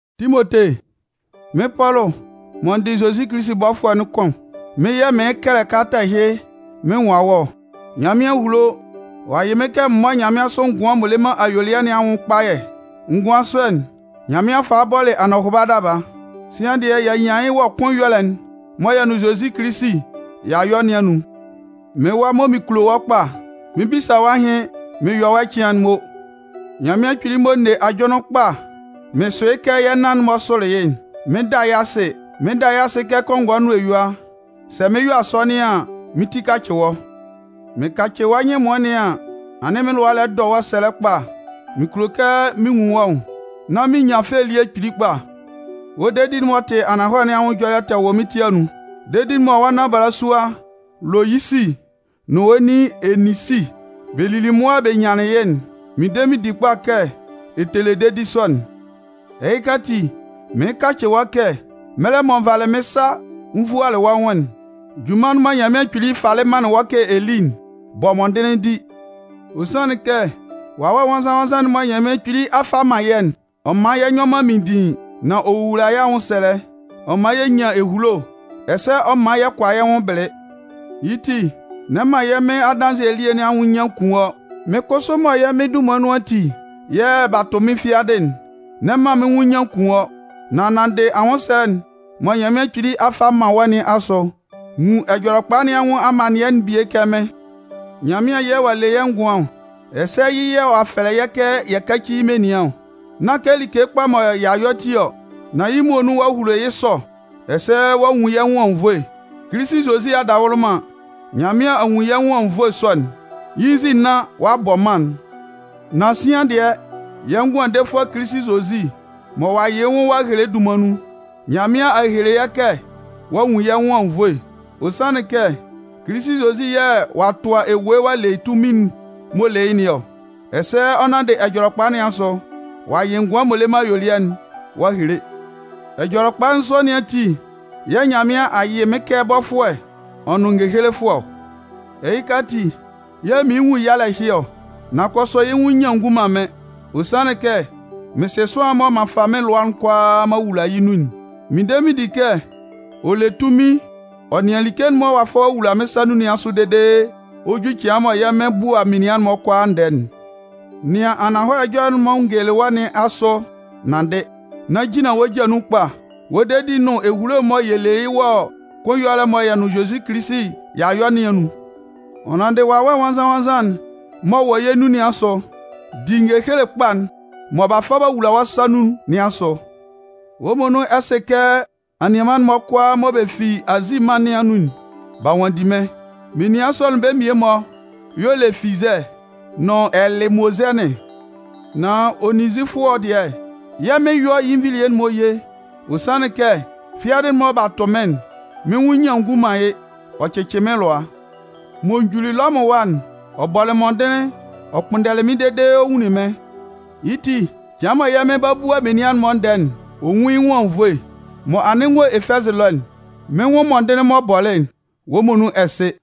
Timote, Mɩ́n Pɔlʋ mɔ n dɩ Kilisi Zozi bɔfʋɛ'n kʋn, mɩ́n yɛ̂ mɩɩn kɛlɛ kalata ɛhɩ mɩn nwan wɔ́ ɔ. Nyanmɩan a hulo, ɔ'a yɩ mɩ́n kɛ m mɔ́ nyanmɩansʋ ngʋan m'ɔ le man ayuelɩɛ nɩn anwʋn kpayɛ. Ngʋan sɔ'n, Nyanmɩan falɩ bɔlɩ anɔhʋba daba. Sian dɩɛ, y'a nyan yɩ́ wɔ kʋn ɛyɔlɛ'n mɔ yɛ nʋn Zozi Kilisi y'a yɔ nɩn anun. Mɩ́n wa mɔ mɩn kulo wɔ́ kpa, mɩn 'bisa wɔ́ ahɩn mɩn yɔ wɔ́ ɛcɩan'n mo. Nyanmɩan Kpili mɔ n ne ajʋnlɩn kpa mɩn sʋ yɩ́ kɛ yɛ nannan-mɔ sʋlɩ yɩ́'n, mɩn 'da yɩ́ asɩ. Mɩn 'da yɩ́ asɩ kɛ kɔngɔɛ nʋn eyua, sɛ mɩn 'yɔ asɔnɩn an, mɩ́n tɩ kacɩ wɔ́. Mɩn kacɩ wɔ́ nyɩn ɛmʋɩn nɩn an, anɩn mɩ́n lʋa lɛ dɔ wɔ́ sɛlɛ kpa mɩn kulo kɛ mɩn nwun wɔ́ nwʋn, nán mɩn nyan fɛ elie kpili kpa. Wɔ́ dedi'n m'ɔ tɩ ananhɔlɛ nɩn anwʋn ɛjɔlɛ tɛ wɔ mɩ́n ti anun. Dedi'n mɔ wɔ́ nan balasua Loyisi nʋn wɔ́ nin Eninsi, bɛ lili mʋa bɛ nyanlɩn yɩ́'n, mɩn de mɩn di kpa kɛ ɛ tɛ le dedi sɔ'n. Ɛhɩka ati, mɩɩn kacɩ wɔ́ kɛ, mɛlɛ mɔ n valɩ mɩ́n sa n vualɩ wɔ́ nwʋn'n, junman'n mɔ Nyanmɩan Kpili falɩ manlɩn wɔ́ kɛ ɛ lí'n, bɔ mɔndɩnlɩn di. Ɔ sanlɩn kɛ Wawɛ Nwannzan-nwannzan'n mɔ Nyanmɩan Kpili a fa a man yɛ́'n, ɔ man yɛ nyɔ man minndiin, nan ɔ wowula yɛ́ anwʋnsɛlɛ, ɔ man yɛ nyan ehulo, ɛsɛ ɔ man yɛ kʋala yɛ́ nwʋn bɩlɩ. Yɩ́ ti n'ɛ man yɛ́ Mɩn adanzɩɛ elie nɩn anwʋn nyian kun wɔ́. Mɩ́n kʋsʋ mɔ yɛ́ Mɩn dunman nun ati yɛ̂ b'a tʋ mɩ́n fiadɩ'n, n'ɛ man mɩ́n nwʋn nyian kun wɔ́. Nan nanndɩ anwʋnsɛlɛ'n mɔ Nyanmɩan Kpili a fa a man wɔ́ nɩn asʋ, nwun Ɛjɔlɛkpa nɩn anwʋn amannɩɛ'n bie kɛ mɩ́n. Nyanmɩan yɛ̂ ɔ'a le yɛ́ ngʋan ɔ, ɛsɛ yɩ́ yɛ̂ ɔ'a fɛlɛ yɛ́ kɛ yɛ káci yɩ́ menian ɔ. Nán kɛ like kpa mɔ y'a yɔ ti ɔ, nan yɩ́ muonun ɔ'a hulo yɩ́ sɔ ɛsɛ ɔ'a nwun yɩ́ nwʋn anwunnvoe. Kilisi Zozi adawʋlʋman, Nyanmɩan a nwun yɛ́ nwʋn anwunnvoe sɔ'n, yɩ́ nzin nán ɔ'a bɔ mân'n. Nan sian dɩɛ, yɛ́ Ngʋandefʋɛ Kilisi Zozi mɔ ɔ'a yɩ yɩ́ nwʋn ɔ'a hele'n dunman nun, Nyanmɩan a hele yɛ́ kɛ ɔ'a nwun yɛ́ nwʋn anwunnvoe. Ɔ sanlɩn kɛ Kilisi Zozi yɛ̂ ɔ'a tʋa ewue ɔ'a le yɩ́ tunmin'n m'ɔ le yɩ́ nɩn ɔ, ɛsɛ ɔ nanndɩ Ɛjɔlɛkpa nɩn asʋ, ɔ'a yɩ ngʋan m'ɔ le man ayuelɩɛ'n ɔ'a hele. Ɛjɔlɛkpa sɔ nɩn ati yɛ̂ Nyanmɩan a yɩ mɩ́n kɛ bɔfʋɛ ɔ nʋn ngehelefʋɛ ɔ. Ɛhɩka ati yɛ̂ mɩɩn nwun yalɛ ɛhɩ ɔ, nan kʋsʋ yɩ́ nwʋn nyian ngun man mɩ́n. Ɔ sanlɩn kɛ mɩn sɩ sʋanlan'n mɔ m'an fa mɩ́n lʋa'n kʋalaa m'an wula yɩ́ nun'n. Mɩn de mɩn di kɛ ɔ le tunmin ɔ nɩan like'n mɔ ɔ'a fa ɔ'a wula mɩ́n sa nun nɩn asʋ dede ɔ 'ju cɩan mɔ yɛ́ Mɩn 'bua menian'n-mɔ kʋalaa ndɛɛ'n. Nɩan ananhɔlɛ ɛjɔlɛ'n mɔ n gelelɩ wɔ́ nɩn asʋ nanndɩ, nán jinlan wɔ́ ja nun kpa wɔ dedi'n nʋn ehulo'n mɔ yɛ le yɩ́ wɔ kʋn ɛyɔlɛ'n mɔ yɛ́ nʋn Zozi Kilisi y'a yɔ nɩn anun. Ɔ nanndɩ Wawɛ Nwannzan-nwannzan'n m'ɔ wɔ yɛ́ nun nɩn asʋ, di ngehele kpa'n mɔ b'a fa b'a wula wɔ́ sa nun nɩn asʋ. Wɔ́ muonun ɛ sɩ kɛ anianman'n-mɔ kʋalaa mɔ bɛ fi Azi mân nɩn anun'n, b'a nwanndi mɩ́n. Menian sɔ'n bɛ́ mmie-mɔ y'ɔ le Fizɛ nʋn Ɛlɩmozɛnɩn. Nan Onezifɔɔ dɩɛ, Yɛ́ Mɩn yɔ́ yɩ́ nvilie'n-mɔ ye. Ɔ sanlɩn kɛ fiadɩ'n mɔ b'a tʋ mɩ́n'n, mɩ́n nwʋn nyian ngun man yɩ́, ɔ cɩcɩ mɩ́n lʋa. M'ɔ juli Lɔmʋn ɛwa'n, ɔ bɔlɩ mɔndɩnlɩn ɔ kpʋnndɛlɩ mɩ́n dede ɔ nwunlin mɩ́n. Yɩ́ ti, cɩan mɔ yɛ́ Mɩn 'ba bua menian'n-mɔ ndɛɛ'n, ɔ nwún yɩ́ nwʋn anwunnvoe. Mɔ anɩn n wɔ Efɛzɩ ɛlɔ'n, mɩ́n nwʋn mɔndɩnlɩn m'ɔ bɔlɩ'n, wɔ́ muonun ɛ sɩ.